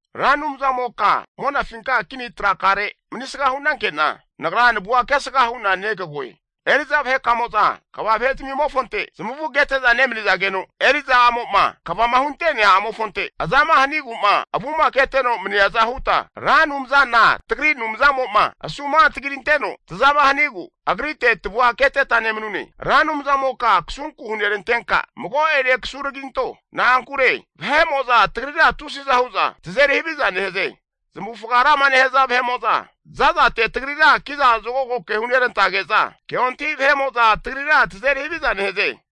Ra Anumzamoka monafinka kini trakare manisga hu'nanke'na, nagra navua kesga hu'na negagoe. Eri'za vahe'mo'za kva vahe zamimofonte zamavu kete'za nemanizageno, eri'za a'mo'a kvama hunte'nea a'mofonte azama hanigu'ma avuma keteno maniaza huta, Ra Anumzana tagri Anumzamo'ma asumantagi ranteno tazama hanigu, agrite tavua keteta nemanune. Ra Anumzamoka kasunku hunerantenka mago'ene kasuragiranto. Na'ankure tagrira tusiza hu'za vahe'mo'za tazeri haviza nehaze. Zamavufga rama nehaza vahe'mo'za za'zate tagrira kiza zokago ke hunerantage'za, keontahi vahe'mo'za tagrira tazeri haviza nehaze.